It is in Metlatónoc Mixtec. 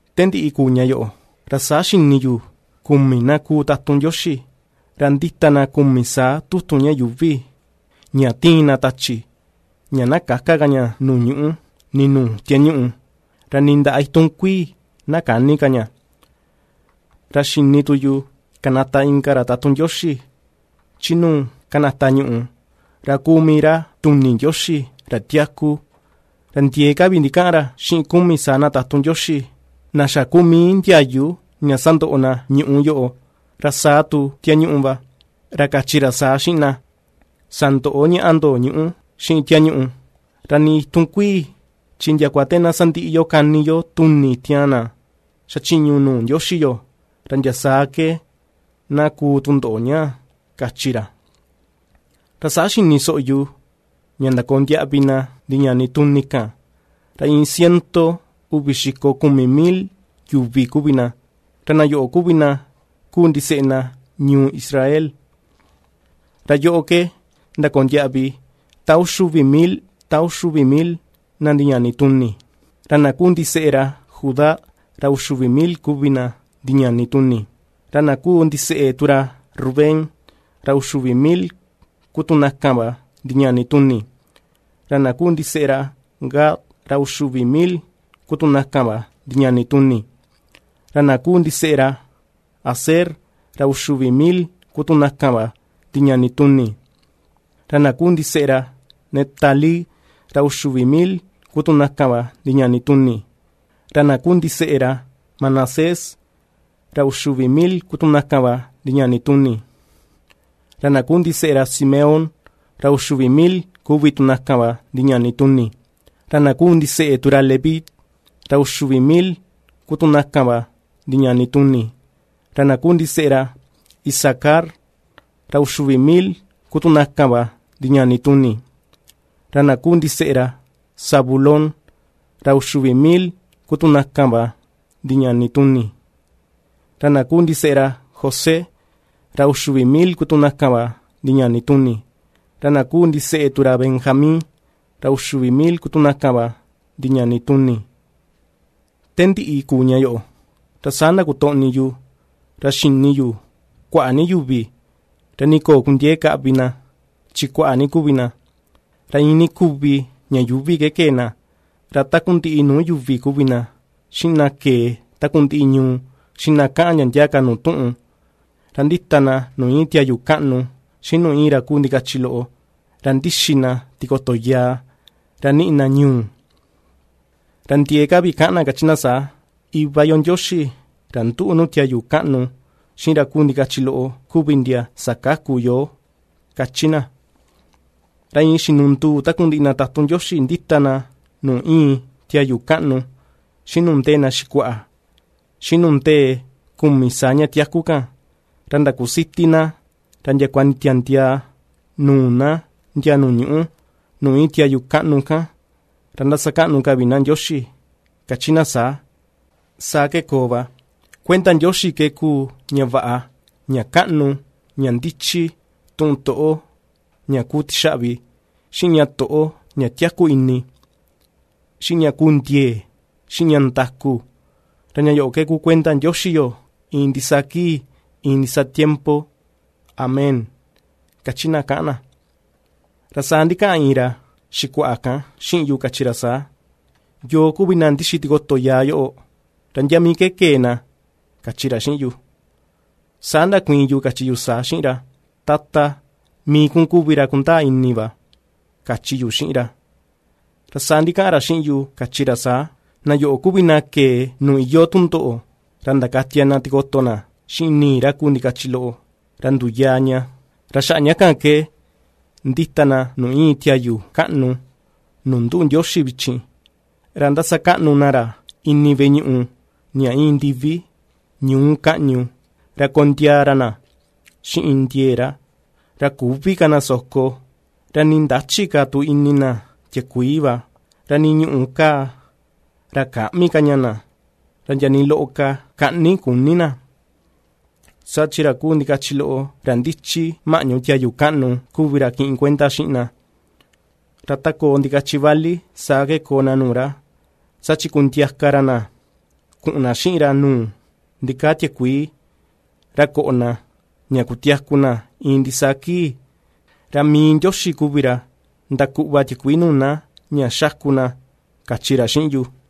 Te ndiꞌi kuu ña yoꞌo, ra saa xini yu kumi na ku tatun Ndioxi, ra ^ndita na kumi saa tutun ña yuuvi, ña ^tiin na tachi, ña na käka ka ña nuu ñuꞌu, nii nuu tiañuꞌu, ra nii ndaꞌa itun kuii na käni ka ña. Ra xini tu yu kanata inka ra tatun Ndioxi, chi nuu ^kanata ñuꞌu, ra kuu mii ra tuni Ndioxi ra tiaku, ra ndiee ka vi ndikaꞌan ra xiꞌin kumi saa na tatun Ndioxi, na xa kuu mii ndiayu ña sandoꞌo na ñuꞌú yoꞌo, ra sa tu tiañuꞌu va. Ra kachi ra saa xiꞌin na: ―Sandöꞌo ñaꞌa ndo ñuꞌú, xiꞌin tiañuꞌu, ra nii itun kuii, chi ndiakua te na sandiꞌi yo kani yo tuni tiaan na xa chiñu nuu Ndioxi yo, ra ndia saa ke na kuu tundoꞌo ñaa ―kachi ra. Ra saa xini soꞌo yu ña ndakoo ndiaꞌvi na ndiñani tuni kan ra iin ciento uvi xiko kumi mil yuvi kuvi na; ra na yoꞌo kuvi na kuu ndiseꞌe na ñuu Israel. Ra yoꞌo ke ndakoo ndiaꞌvi ta uxi uvi mil ta uxi uvi mil na ndiñani tuni: Ra na kuu ndiseꞌe ra Judá ra uxi uvi mil kuvi na ndiñani tuni; ra na kuu ndiseꞌe tu ra Rubén ra uxi uvi mil ku tu na kan va ndiñani tuni; ra na kuu ndiseꞌe ra Gad, ra uxi uvi mil ku tu na kan va ndiñani tuni; Ra na kuu ndiseꞌe ra Aser, ra uxi uvi mil ku tu na kan va ndiñani tuni; ra na kuu ndiseꞌe ra Neftalí, ra uxi uvi mil ku tu na kan va ndiñani tuni; ra na kuu ndiseꞌe ra Manasés, ra uxi uvi mil ku tu na kan va ndiñani tuni; Ra na kuu ndiseꞌe ra Simeón, ra uxi uvi mil kuvi tu na kan va ndiñani tuni; ra na kuu ndiseꞌe tu ra Leví, ra uxi uvi mil ku tu na kan va ndiñani tuni; ra na kuu ndiseꞌe ra Isacar, ra uxi uvi mil ku tu na kan va ndiñani tuni; Ra na kuu ndiseꞌe ra Zabulón, ra uxi uvi mil ku tu na kan va ndiñani tuni; ra na kuu ndiseꞌe ra José, ra uxi uvi mil ku tu na kan va ndiñani tuni; ra na kuu ndiseꞌe tu ra Benjamín, ra uxi uvi mil ku tu na kan va ndiñani tuni. Te ndiꞌi kuu ña yoꞌo, ra saa ndakotoꞌni yu, ra xini yu kuaꞌa ni yuvi, ra nii köo kundiee kaꞌvi na chi kuaꞌa ni kuvi na, ra iin ni kuvi ña yuuvi ke kee na, ra takundiꞌi nuu yuvi kuvi na, xiꞌin na kee takundiꞌi ñuu, xiꞌin na kaꞌan ndia ndia ka nuu tuꞌun, ra ^ndita na nuu íin tiayu kaꞌnu, xiꞌin nuu íin ra kuu ndikachi loꞌo, ra ^ndixi na tikoto yaa, ra ^niꞌi na ñu̱u̱. Ra ndiee ka vi kaꞌan na kachi na saa: “Iva yo Ndioxi ra ^nduꞌu nuu tiayu kaꞌnu xiꞌin ra kuu ndikachi loꞌo kuvi ndia ^sakaku yoo”, ^kachi na. Ra iin xinunduu takundiꞌi na tatun Ndioxi ^ndita na nuu íin tiayu kaꞌnu, xiꞌin nuu ndee na xikuaꞌa, xiꞌin nuu ndee kumi saa ña tiaku kan, ra ndakusiti na, ra ndiakua nditiandiaa nuu na ndia nuu ñuꞌu, nuu íin tiayu kaꞌnu kan, ra ^ndasakaꞌnu ka vi na Ndioxi, ^kachi na saa: ¡Saa ke koo va! Kuenda Ndioxi ke kuu ña vaꞌa, ña kaꞌnu, ña ndichi, tuꞌun toꞌo ña kuu tixaꞌvi, xiꞌin ña toꞌo ña tiaku ini, xiꞌin ña ku ndiee, xiꞌin ña ndaku. Ra ña yoꞌo ku kuenda Ndioxi yo iin ndisaa kii, iin ndisaa tiempo. Amén, kachi na kaꞌan na. Ra saa ndikaꞌan iin ra xikuaꞌa kan xiꞌin yu kachi ra saa: ―¿Yoo kuvi na ndixi tikoto yaa yoꞌo, ra ndia mii ke kee na? ―kachi ra xiꞌin yu. Saa ndakuiin yu kachi yu saa xiꞌin ra: ―Tata, mii kun kuvi ra kundaa ini va ―kachi yu xiꞌin ra. Ra saa ndikaꞌan ra xiꞌin yu kachi ra saa: ―Na yoꞌo kuvi na kee nuu iyoo tundoꞌo ra ndakatia na tikoto na xiꞌin ni̱i̱ ra kuu ndikachi loꞌo, ra nduyaa ña. Ra xaꞌa ña kan ke ^ndita na nuu íin tiayu kaꞌnu nuu nduꞌu Ndioxi vichin, ra ^ndasakaꞌnu na ra ini veꞌe ñuꞌu ña íin ndivi, ñuu kaꞌñu, ra kondiaa ra na xiꞌin ndiee ra. Ra küvi ka na soko, ra nii ndächi ka tu ini na tiakuii va, ra nii ñuꞌù kaa, ra käꞌmi ka ña na, ra ndia nii loꞌo ka kaꞌni küni na. Saa chi ra kuu ndikachi loꞌo ra ndichi maꞌñu tiayu kaꞌnu kuvi ra kiꞌin kuenda xiꞌin na; ra ta koo ndikachi vali saa ke koo na nuu ra, saa chi kundiaka ra na kuꞌun na xiꞌin ra nuu ndikaa tiakuii, ra koꞌo na, ña kutiaku na iin ndisaa kii. Ra mii Ndioxi va kuvi ra ndakuꞌva tiakuii nuu na ña ^xáku na ―kachi ra xiꞌin yu.